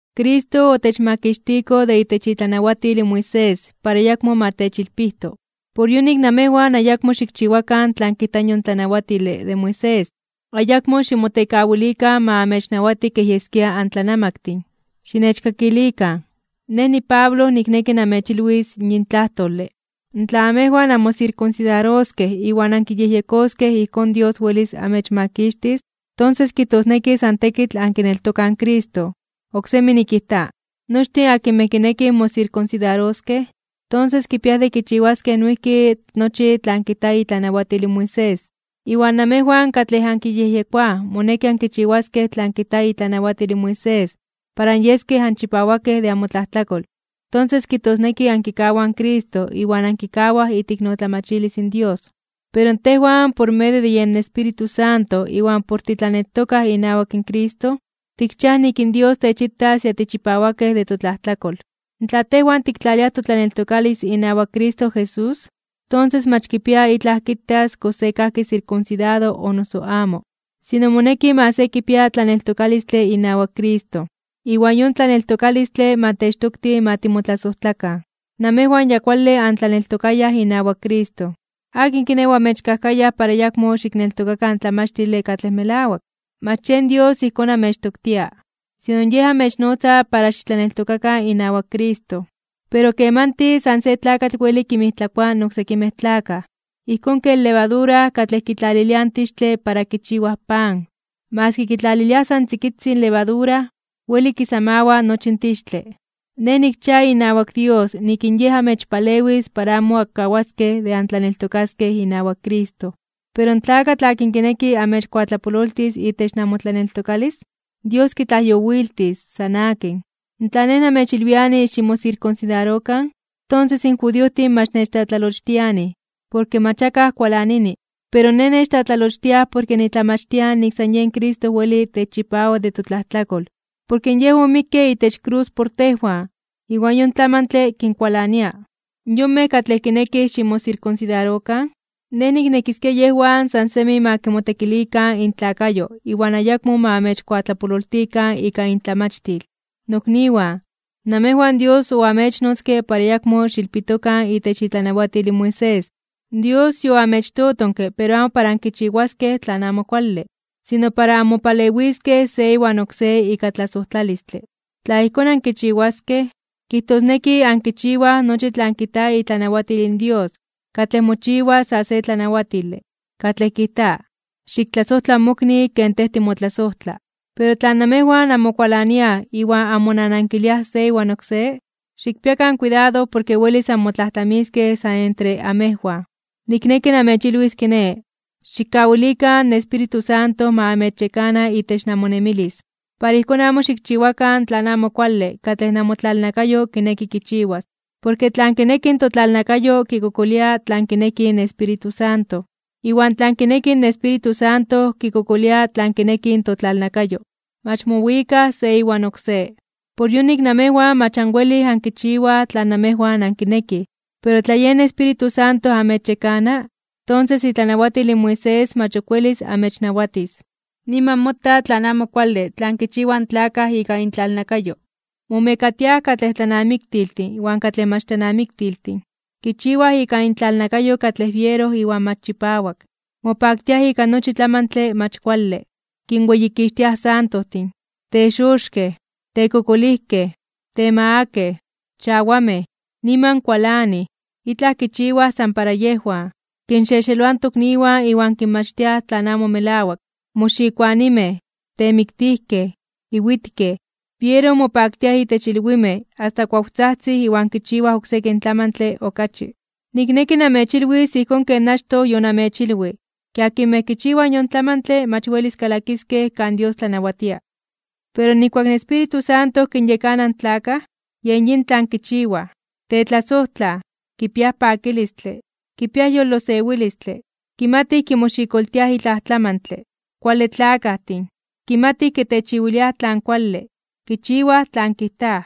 Cristo otechmakixtiko de itech itlanawatil in Moisés para ayakmo ma techilpijto. Por yonik namejwan ayakmo xikchiwakan tlan kijta yon tlanawatile de Moisés. Ayakmo ximotekawilikan ma amechnawati kej yeskia antlanamaktin. Xinechkakilikan. Nej, niPablo, nikneki namechilwis yin tlajtole, tla namejwan anmosirkunsidaroskej iwan ankiyejyekoskej ijkón Dios welis amechmakixtis, tonses kijtosneki san tekitl ankineltokaj in Cristo. Oksemi nikijta: Nochtin akinmej kinekij mosirkunsidaroskej, tonses kipiaj de kichiwaskej noijki nochi tlan kijta itlanawatil in Moisés. Iwan namejwan katlej ankiyejyekoaj moneki ankichiwaskej tlan kijta itlanawatil in Moisés para anyeskej anchipawakej de amotlajtlakol, tonses kijtosneki ankikawaj in Cristo iwan ankikawaj iteiknotlamachilis in Dios. Pero tejwan por medio de yen Espíritu Santo iwan por titlaneltokaj inawak Cristo, tikchiaj nik in Dios techitas ya tichipawakej de totlajtlakol. Tla tejwan tiktlaliaj totlaneltokalis inawak Cristo Jesús, tonses mach kipia itlaj kitas kox se kajki sirkunsidado o noso amo. Sino moneki ma se kipia tlaneltokalistle inawak Cristo, iwan yon tlaneltokalistle ma techtokti ma timotlasojtlakan. Namejwan ya kuale antlaneltokayaj inawak Cristo. ¿Akin kiné, oamechkajkayaj para ayakmo xikneltokakan in tlamachtile katlej melawak? Mach yen Dios ijkón amechtoktia, sino Yej amechnotza para xitlaneltokakan inawak Cristo. Pero kemanti san se tlakatl weli kinmijtlakoa oksekimej tlakaj. Ijkón ken levadura katlej kitlaliliaj in tixtle para kichiwaj pan, maski kitlaliliaj san tzikitzin levadura, weli kisamawa nochi in tixtle. Nej nikchia inawak Dios nik in Yej amechpalewis para amo ankawaskej de antlaneltokaskej inawak Cristo. Pero in tlakatl akin kineki amechkuatlapololtis itech namotlaneltokalis, Dios kitlajyowiltis, san akin. Tla nej namechilwiani ximosirkunsidarokan, tonses in judiojtin mach nechtlatlalochtianij, porke mach akaj kualanini. Pero nej nechtlatlalochtiaj porke nitlamachtia nik san yen Cristo weli techchipawa de totlajtlakol porke Yej omikke itech krus por tejwan iwan yon tlamantle kinkualania. Yonmej katlej kinekij ximosirkunsidarokan, nej niknekiskia yejwan san semi ma kimotekilikan intlakayo iwan ayakmo ma amechkuatlapololtikan ika intlamachtil. Nokniwan, namejwan Dios oamechnotzke para ayakmo xiilpitokan itech itlanawatil in Moisés. Dios yoamechtotonke pero amo para ankichiwaskej tlan amo kuale, sino para anmopalewiskej se iwan oksé ika tlasojtlalistle. Tla ijkón ankichiwaskej, kijtosneki ankichiwaj nochi tlan kijta itlanawatil in Dios katlej mochiwa sa se tlanawatile, katlej kijta: “Xiktlasojtla in mokni ken tej timotlasojtla.” Pero tla namejwan anmokualaniaj iwan anmonanankiliaj se iwan oksé, xikpiakan kuidado porke welis anmotlajtlamiskej san entre amejwan. Nikneki namechilwis kiné: Xikkawilikan in Espíritu Santo ma amechyekana itech namonemilis. Para ijkón amo xikchiwakan tlan amo kuale katlej namotlalnakayo kineki kichiwas. Porke tlan kineki in totlalnakayo kikokolia tlan kineki in Espíritu Santo. Iwan tlan kineki in Espíritu Santo kikokolia tlan kineki in totlalnakayo. Mach mowikaj se iwan oksé. Por yonik namejwan mach anwelij ankichiwaj tlan namejwan ankinekij. Pero tla yen Espíritu Santo namechyekana, tonses itlanawatil in Moisés mach ok welis anmechnawatis. Niman mota tlan amo kuale tlan kichiwaj in tlakaj ika intlalnakayo. Momekatiaj katlej tlanamiktiltin iwan katlej mach tlanamiktiltin, kichiwaj ika intlalnakayo katlej biero iwan mach chipawak, mopaktiaj ika nochi tlamantle mach kuale (vicios). Kinweyikixtiaj santojtin, texoxkej (tlabrujowiaj), tekokolijkej, temagakej (temakakej), chawamej, niman kualanij, itlaj kichiwaj san para yejwan, kinxexeloaj in tokniwan iwan kinmachtiaj tlan amo melawak. Moxikoanimej, temiktijkej, iwitkej, biero mopaktiaj itech ilwimej asta kuawtzajtzij iwan kichiwaj oksekin tlamantle okachi. Nikneki namechilwis ijkón ken achtoj yonamechilwij, ke akinmej kichiwaj yon tlamantle mach welis kalakiskej kan Dios tlanawatia. Pero nijkuak in Espíritu Santo kinyekana in tlakaj, yen yin tlan kichiwaj: tetlasojtlaj, kipiaj pakilistle, kipiaj yolosewilistle, kimatij kimoxikoltiaj itlaj tlamantle, kuale tlakajtin, kimatij kitechiwiliaj tlan kuale, kichiwaj tlan kijtaj,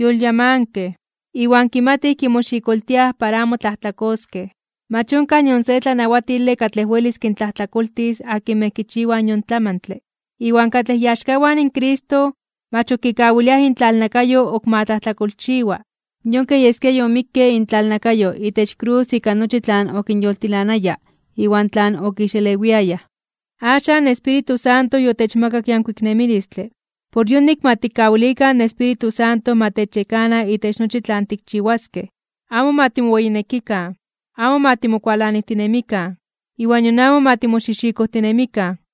yolyamankej, iwan kimatij kimoxikoltiaj para amo tlajtlakoskej. Mach onkaj nion se tlanawatile katlej welis kintlajtlakoltis akinmej kichiwaj yon tlamantle. Iwan katlej iaxkawan in Cristo, mach ok kikawiliaj intlalnakayo ok ma tlajtlakolchiwa. Yon kej yeskia yomikke intlalnakayo itech krus ika nochi tlan okinyoltilanaya iwan tlan okixelewiayaj. Axan in Espíritu Santo yotechmakak yankuik nemilistle, por yonik ma tikkawilikan in Espíritu Santo ma techyekana itech nochi tlan tikchiwaskej. Amo ma timoweyinekikan. Amo ma timokualanijtinemikan, iwan nion amo ma timoxijxikojtinemikan.